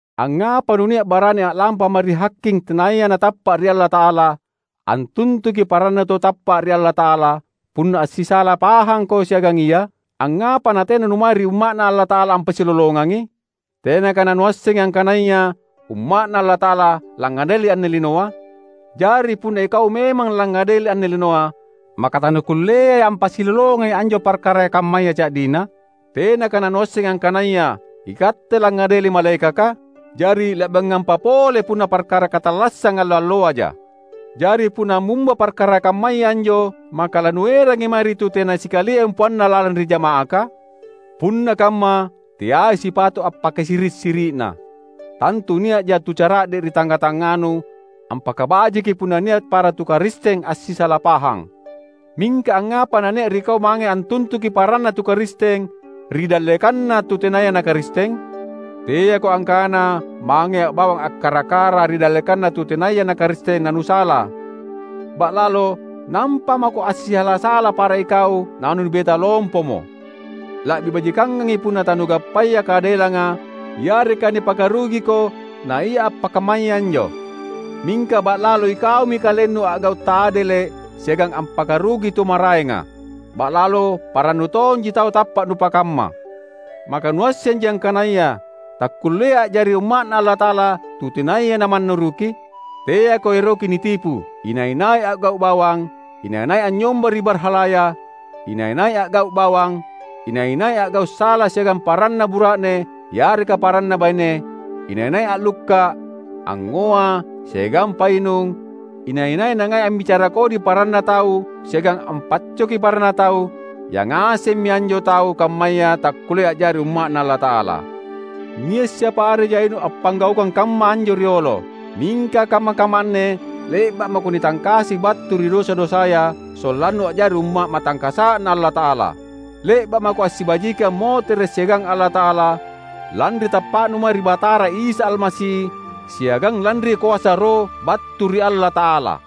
Angngapa nunia’ barani a’lampa mae ri haking tenaya natappa’ ri Allata’ala antuntuki parannu tau tappa’ ri Allata’ala, punna assisala pahangko siagang ia? Angngapa natena numae ri umma’Na Allata’ala ampassilolongangi? Tenaka nanuassengi angkanaya umma’Na Allata’ala langngadeli anne linoa? Jari punna ikau memang langngadeli anne linoa, maka tanukulleai ampassilolongangi anjo parkara kammaya ca’dina? Tenaka nanuassengi angkanaya ikatte langngadeli malaekaka? Jari la’biangampa pole punna parkara katallassang allo-alloaja. Jari punna ammumba parkara kammaya anjo maka lanuerangi mae ri tu tena sikalia empoanna lalang ri jama’aka? Punna kamma, teai sipato’ appakasiri’-siri’na! Tantu nia’ja tu cara’de’ ri tangnga-tangnganu ampakabajiki punna nia’ para tu Karisteng assisala pahang! Mingka angngapa nania’ ri kau mange antuntuki paranna tu Karisteng ri dallekanna tu tenaya na Karisteng? Teako angkana mangea bawang akkara-kara ri dallekanna tu tenaya na Karisteng nanusala; ba’lalo nampa mako assisala-sala para ikau nanunibeta lompomo. La’bi bajikangangi punna tanugappaya kaadelanga yareka nipakarugiko naia appakammaya anjo! Mingka, ba’lalo ikaumi kalennu a’gau’ taadele’ siagang ampakarugi tu maraenga! Ba’lalo parannu tonji tau tappa’ nupakamma! Maka nuassenji angkanaya takkulleai a’jari umma’Na Allata’ala tu tenaya namannuruki? Teako eroki nitipu. Inai-nai a’gau’ bawang, inai-nai anynyomba ri barhalaya, inai-nai a’gau’ bawang, inai-nai a’gau’ sala siagang paranna bura’ne yareka paranna baine, inai-nai a’lukka’, angngoa, siagang painung, inai-nai nangai ambicara kodi paranna tau siagang ampaccoki paranna tau — yangasemmi anjo tau kammaya takkullea a’jari umma’Na Allata’ala. Nia’ siapa are jainu appanggaukang kamma anjo riolo. Mingka kamma-kamma anne le’ba’ mako nitangkasi battu ri dosa-dosaya, sollannu a’jari umma’ matangkasa’Na Allata’ala. Le’ba’ mako assibajiki ammotere’ siagang Allata’ala lanri tappa’nu mae ri Batara Isa Almasi siagang lanri koasa Roh battu ri Allata’alata.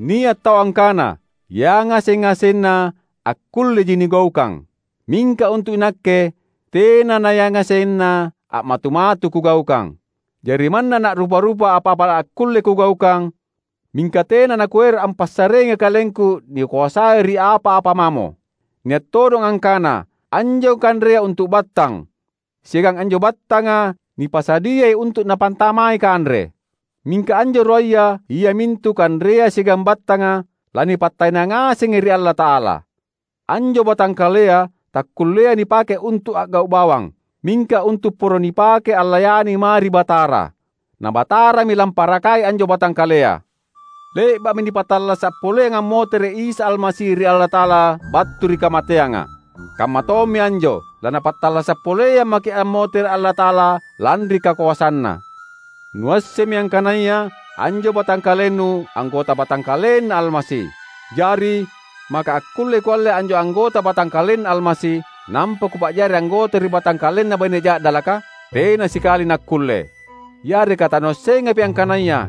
Nia’ tau angkana, "Yangaseng-ngasenna akkulleji nigaukang." Mingka untu’ inakke tena nayangasenna a’matu-matu kugaukang. Jari manna na’rupa-rupa apa-apa akkulle kugaukang, mingka tena nakuero’ ampassareangi kalengku nikoasai ri apa-apa mamo. Nia’ todong angkana, anjo kanrea untu’ battang, siagang anjo battanga nipasadiai untu’ napantamai kanre. Mingka anjo ruaya, iamintu kanrea siagang battanga lanipattaena ngasengi ri Allata’ala. Anjo batangkalea takkulleai nipake untu’ a’gau’ bawang, mingka untu’ poro nipake allayani mae ri Batara. Na Batarami lamparakai anjo batangkalea. Le’ba’mi nipattallasa’ poleang ammotere’ Isa Almasi ri Allata’ala battu ri kamateanga; kammatommi anjo, laNapattallasa’ poleang maki’ ammotere’ Allata’ala lanri kakoasanNa. Nuassemmi angkanaya anjo batangkalennu anggota batangkalenNa Almasi. Jari, maka akkullei kualle anjo anggota batangkalenNa Almasi, nampa kupa’jari anggota ri batangkalenna baine ja’dalaka? Tena sikali nakkulle! Yareka tanuassengapi angkanaya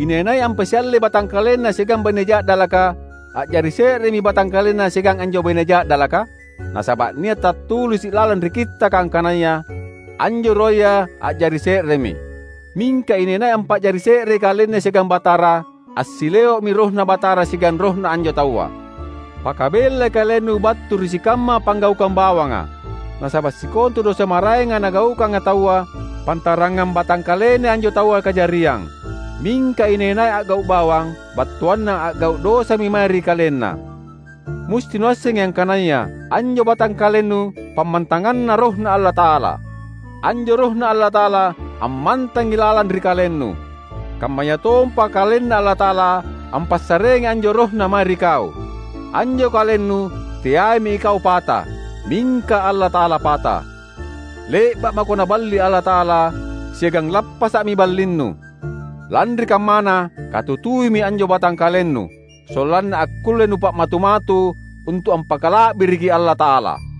inai-nai ampasiallei batangkalenna siagang baine ja’dalaka, a’jari se’remi batangkalenna siagang anjo baine ja’dalaka? Nasaba’ nia’ tattulisi’ lalang ri Kittaka angkanaya, "Anjo ruaya a’jari se’remi." Mingka inai-nai ampa’jari se’rei kalenna siagang Batara, assileo’mi RohNa Batara siagang rohna anjo taua. Pakabellai kalennu battu ri sikamma panggaukang bawanga. Nasaba’ sikontu dosa maraenga nagaukanga taua, pantarangang batangkalennai anjo taua kajariang. Mingka inai-nai a’gau’ bawang, battuanna a’gau’ dosami mae ri kalenna. Musti nuassengi angkanaya anjo batangkalennu pammantanganNa RohNa Allata’ala. Anjo RohNa Allata’ala ammantangi lalang ri kalennu. Kammayatompa KalenNa Allata’ala ampassareangi anjo RohNa mae ri kau. Anjo kalennu teaimi ikau pata, mingka Allata’ala pata. Le’ba’ mako Naballi Allata’ala, siagang lappasa’mi ballinnu. Lanri kammana, katutuimi anjo batangkalennu, sollanna akkulle nupa’matu-matu untu’ ampakala’biriki Allata’ala.